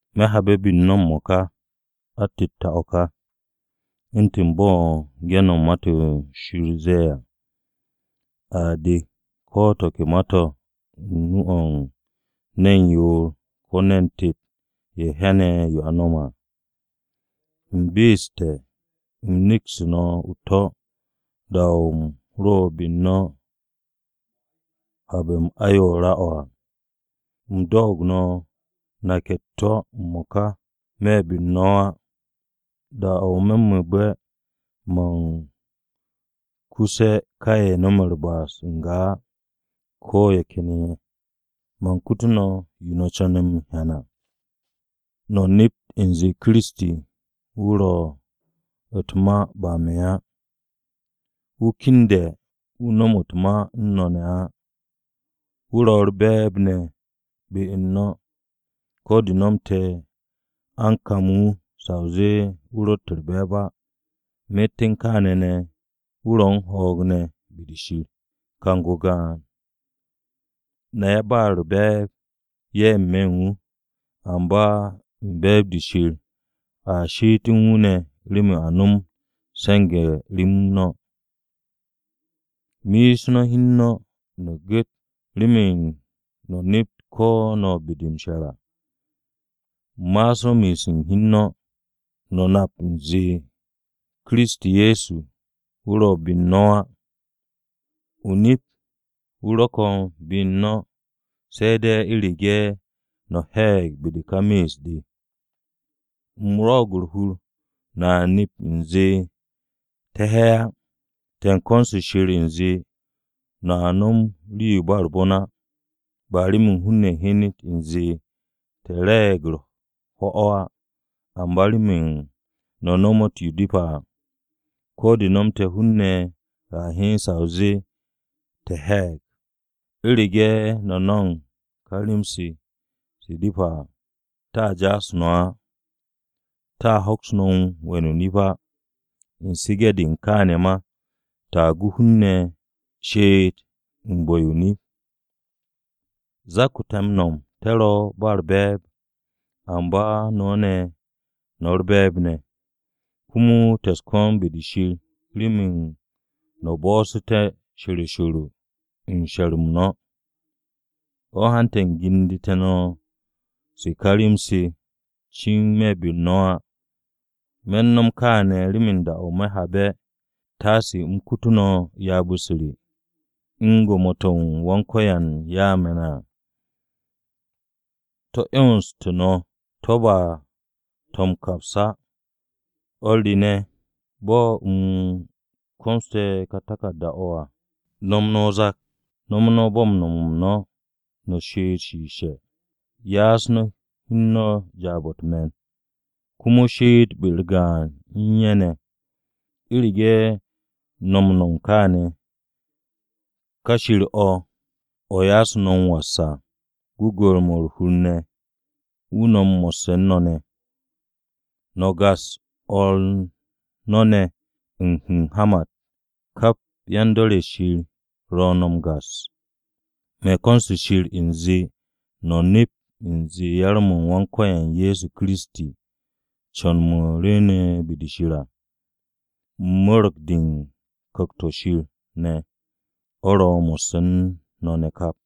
Me̱ habe̱ be-u̱r no̱ m-mo̱ka, atette̱-o̱ ka. U̱ntu̱n bo̱ ge̱n-mo̱ u̱n Ma-to̱ Shir ze̱e̱ à, “A dek ko̱ to̱ ke ma-to̱ u̱n nu-o̱ u̱n ne̱n yoor ko̱ ne̱n tet ye̱ hyane̱ yo no̱me̱ à.” U̱m be'este̱, u̱m nekste̱ no̱ u̱t-to̱ da-o̱ u̱m ro be-u̱r no̱ habe̱-m ayoore̱-mo̱ à. U̱m doog no̱ nake̱ u̱t-to̱ m-mo̱ka me̱ be-u̱r no̱ á: Da-o̱ me̱ mu̱u̱be̱ man kuse̱ ka ye̱ no̱me̱ u̱r-ba'as n-ga á ko̱ ye̱ ken ye̱. Man kutu no̱ yo no̱ co̱ne̱ m-hyan à. No̱ nept u̱nze Kiristi wu̱ ro̱ u̱t-ma ba me̱ á. Wu̱ kende̱ wu̱ nomot u̱n no̱ ne̱ á. Wu̱ ro̱ u̱r-be̱e̱b ne̱ be-u̱r no̱. Ko̱ de no̱mte̱ a u̱n kam wu̱ sa o zee wu̱ ro̱tt u̱r-be̱e̱b á, myet u̱n kaane̱ ne̱ wu̱ ro̱ u̱n ho̱o̱g ne̱ be-de Shir. Kang-o gaan, na yan-ba-u̱r-be̱e̱b ye̱ n-me̱ u̱n wu̱, amba u̱n be̱e̱b-de Shir a she'et u̱n wu̱ ne̱ remen a nomot m-se̱nge̱ rem no̱. Me'es no̱ hi u̱n no̱, no̱ gu̱t remen no̱ nept ko̱ no̱ be-de m-she̱r à. Ma'as no̱ me'es u̱n hi u̱n no̱. ¿No̱ nap u̱nze Kiristi Ye̱so wu̱ ro̱ be u̱n no̱ á? O-nip wu̱ ro̱ ko̱n be u̱n no̱, se̱ de̱ u̱rege̱ no̱ he̱e̱g be-de u̱n ka me'es-de. U̱m rwo̱'o̱g u̱r-hur no̱a nep u̱nze te̱ he̱ á. Te̱ u̱n ko̱n-se Shir u̱nze no̱a nom rii-yo ba u̱r-bon á. Ba remen hun-ne̱ hyenet u̱nze te̱ re̱e̱g u̱r-ho̱ á, amba remen no̱ nomot yo depe̱ à ko̱ de no̱mte̱ hun-ne̱ a hyen sa o zee te̱ he̱e̱g. U̱rege̱ no̱ m-no̱m ka rem-se se depe̱ à, te̱a ja'as no̱ á. Te̱a hoks we̱n o-nip á, u̱n su̱ge̱-de u̱n kaane̱ ma, te̱a gu hun-ne̱ she'et u̱n bu̱-yo o-nip. Zak-o̱ te̱ m-nom te̱ ro ba u̱r-be̱e̱b, amba no̱ ne̱ no̱ u̱r-be̱e̱b ne̱. Komo te̱ u̱s-ko̱n be-de Shir remen no̱ bo̱'o̱sse̱té̱ she̱ro she̱ro u̱n she̱r-m no̱. O̱ hante̱ u̱m gendu̱te̱ no̱ se ka rem-se cin me̱ be-u̱r no̱ á. Me̱ no̱m kaane̱ remen da-o̱ me̱ habe̱, taase u̱m kutu no̱ ryaab-u̱s re, u̱n gwo̱mo-to̱ Wan-Ko̱yan ya'u̱ me̱ à. To̱ m-'yonsté̱ no̱ to̱ ba to̱ m-kaps á. O̱r re ne̱, bo̱ u̱m komoste̱ kà taku̱rda-o̱, no̱m no̱ o-zak! No̱m no̱ bo̱ u̱n nom-m no̱, no̱ she'ete̱ shiishe̱. Doo no̱ o̱r no̱ ne̱ jaab-o̱ u̱t-me̱n, komo she'et be-u̱r gaan u̱n ye̱ ne̱. U̱rege̱ no̱ no̱m kaane̱, ka Shir-o̱ o̱ ya'as no̱ m-was, u̱n gwu̱gwu̱-mo̱ u̱r-hur ne̱ à, wu̱ no̱m mo̱sse̱ u̱n no̱ ne̱. No̱ gas o̱r no̱ ne̱ hu̱nhamat. Kap yan-dor-ye̱ Shir ro̱ no̱ u̱r-gas. Me̱n ko̱n-se Shir u̱nze no̱ nept u̱nze yar-m Wan-Ko̱yan Ye̱so Kiristi, co̱n-mo̱ rwu̱u̱ne̱ be-de Shir, u̱n mo̱rge̱-de u̱n Ku̱kt-o̱ Shir ne̱, mo̱ ro̱ mo̱sse̱ u̱n no̱ ne̱ kap!